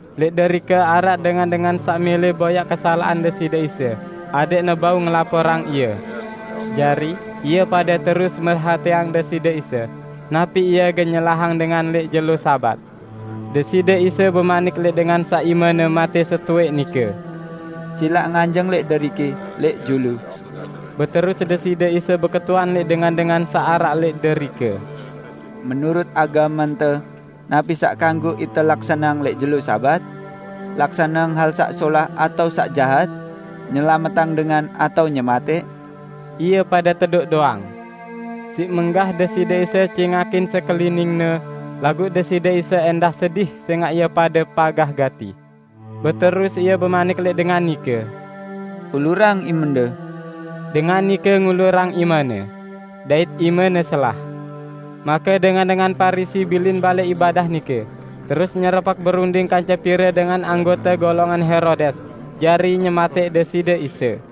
Lẽq derike araq dengan-dengan saq mẽlẽ boyaq kesalaqan Deside Isa adẽqne bau ngelaporang Ie. Jari, ie pade terus merhatiang Deside Isa, napi Ie gen nyelahang dengan lẽq jelo Sabat. Deside Isa bemanik lẽq dengan saq imene matẽ setowẽq nike, "Silaq nganjeng lẽq deriki, lẽq julu." Beterus Deside Isa beketuan lẽq dengan-dengan saq araq lẽq derike, "Menurut agamente, napi saq kanggo ite laksaneang lẽq jelo Sabat? Laksaneang hal saq solah atao saq jahat? Nyelametang dengan atao nyematẽq?" Ie pade tedoq doang. Siq menggah Deside Isa cingakin sekelining-Ne, laguq Deside Isa ẽndah sedih sẽngaq ie pade pagah gati. Beterus Ie bemanik lẽq dengan nike, "Ulurang imende." Dengan nike ngulurang imene, dait imene selah. Make dengan-dengan Parisi bilin balẽ ibadah nike, terus nyerepek berunding kance pire dengan anggote golongan Herodes jari nyematẽq Deside Isa.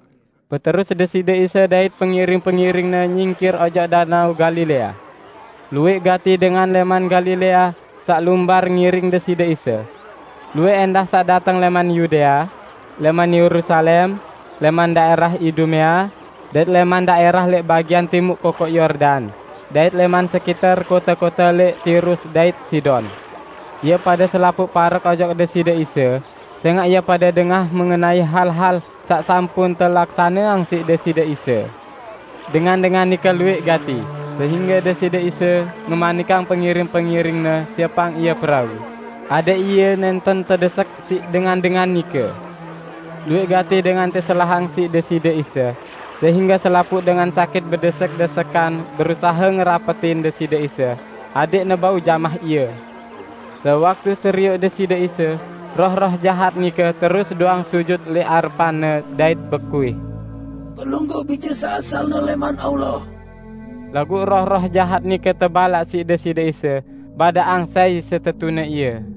Beterus Deside Isa dait pengiring-pengiring-Ne nyingkir ojok Danao Galilea. Luwẽq gati dengan lẽman Galilea saq lumbar ngiring Deside Isa. Luwẽq ẽndah saq dateng lẽman Yudea, lẽman Yerusalem, lẽman daẽrah Idumea, dait lẽman daẽrah lẽq bagian timuq Kokoq Yordan, dait lẽman sekiter kote-kote lẽq Tirus dait Sidon. Ie pade selapuq parek ojok Deside Isa, sẽngaq ie pade dengah mengenai hal-hal saq sampun telaksaneang siq Deside Isa. Dengan-dengan nike luwẽq gati, sehingge Deside Isa ngemanikang pengiring-pengiring-Ne siepang Ie perau, adẽq Ie nẽnten tedesek siq dengan-dengan nike. Luwẽq gati dengan teselahang siq Deside Isa, sehingge selapuq dengan sakit bedesek-desekan berusahe ngerapetin Deside Isa adẽqne bau jamah Ie. Sewaktu serioq Deside Isa, roh-roh jahat nike terus doang sujut lẽq arepan-Ne dait bekuih, "Pelungguh Bije saq asalne lẽman Allah!" Laguq roh-roh jahat nike tebalaq siq Deside Isa badaqang sai setetune Ie.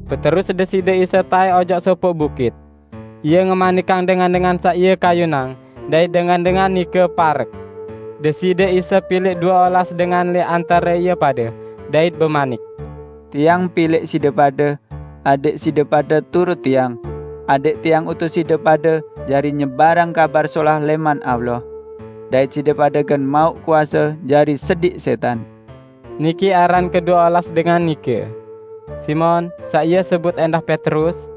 Beterus Deside Isa taẽk ojok sopoq bukit. Ie ngemanikang dengan-dengan saq Ie kayunang dait dengan-dengan nike parek. Deside Isa pilẽq due olas dengan lẽq antare ie pade, dait bemanik, "Tiang pilẽq side pade, adẽq side pade turut Tiang, adẽq Tiang utus side pade jari nyebarang Kabar Solah lẽman Allah, dait side pade gen mauq kuase jari sediq sẽtan." Niki aran kedue olas dengan nike: Simon (saq Ie sebut ẽndah Petrus),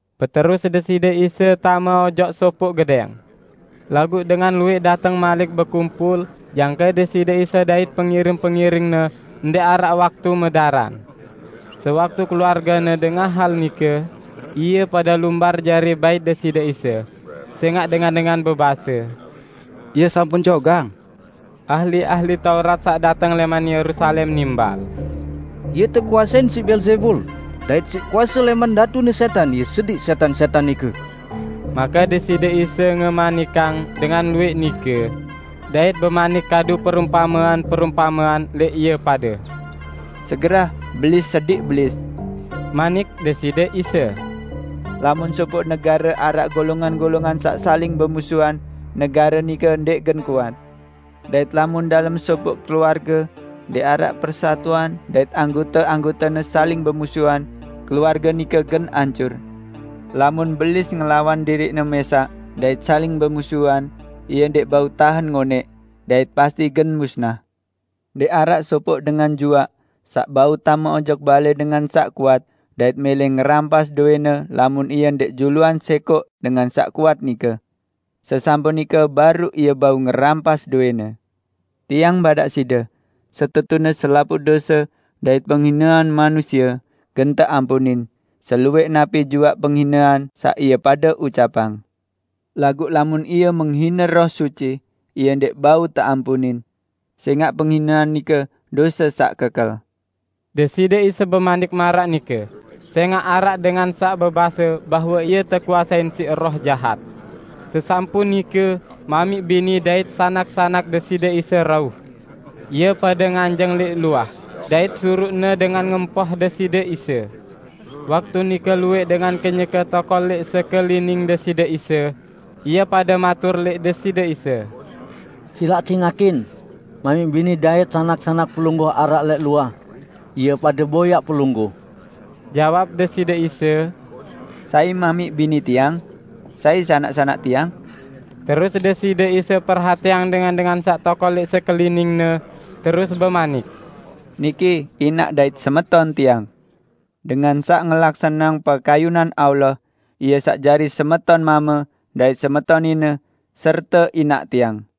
Beterus Deside Isa tame ojok sopoq gedẽng. Laguq dengan luwẽq dateng malik bekumpul, jangke Deside Isa dait pengiring-pengiring-Ne ndẽq araq waktu medaran. Sewaktu keluarge-Ne dengah hal nike, ie pade lumbar jari bait Deside Isa, sẽngaq dengan-dengan bebase, "Ie sampun jogang!" Ahli-ahli Taurat saq dateng lẽman Yerusalem nimbal, "Ie tekuasein siq Beelzebul, dait siq kuase lẽman datune sẽtan Ie sediq sẽtan-sẽtan nike." Make Deside Isa ngemanikang dengan luwẽq nike, dait bemanik kadu perumpamean-perumpamean lẽq ie pade. "Segerah Belis sediq Belis," manik Deside Isa. "Lamun sopoq negare araq golongan-golongan saq saling bemusuhan negare nike ndẽq gen kuat. Dait lamun dalem sopoq keluarge ndẽq araq persatuan dait anggote-anggotene saling bemusuhan, keluarge nike gen ancur. Lamun Belis ngelawan diriqne mẽsaq dait saling bemusuhan, ie ndẽq bau tahen ngonẽq, dait pasti gen musnah. Ndẽq araq sopoq dengan juaq saq bau tame ojok balẽ dengan saq kuat dait mẽlẽ ngerampas dowẽne lamun ie ndẽq juluan sẽkoq dengan saq kuat nike. Sesampun nike baruq ie bau ngerampas dowẽne. Tiang badaq side: Setetune selapuq dose dait penghinean manusie gen teampunin, seluwẽq napi juaq penghinean saq ie pade ucapang. Laguq lamun ie menghine Roh Suci, ie ndẽq bau teampunin! Sẽngaq penghinean nike dose saq kekel!" ( Deside Isa bemanik maraq nike sẽngaq araq dengan saq bebase bahwe Ie tekuasein siq roh jahat.) Sesampun nike, mamiq bini dait sanak-sanak Deside Isa rauh. Ie pade nganjeng lẽq luah, dait suruqne dengan ngempoh Deside Isa. Waktu nike luwẽq dengan kenyeke tokol lẽq sekelining Deside Isa. Ie pade matur lẽq Deside Isa, "Silaq cingakin, mamiq bini dait sanak-sanak Pelungguh araq lẽq luah. Ie pade boyaq Pelungguh." Jawab Deside Isa, "Sai mamiq bini Tiang? Sai sanak-sanak Tiang?" Terus Deside Isa perhatiang dengan-dengan saq tokol lẽq sekelining-Ne terus bemanik, "Niki inaq dait semeton Tiang! Dengan saq ngelaksaneang pekayunan Allah, ie saq jari semeton mame dait semeton nine serte inaq Tiang!"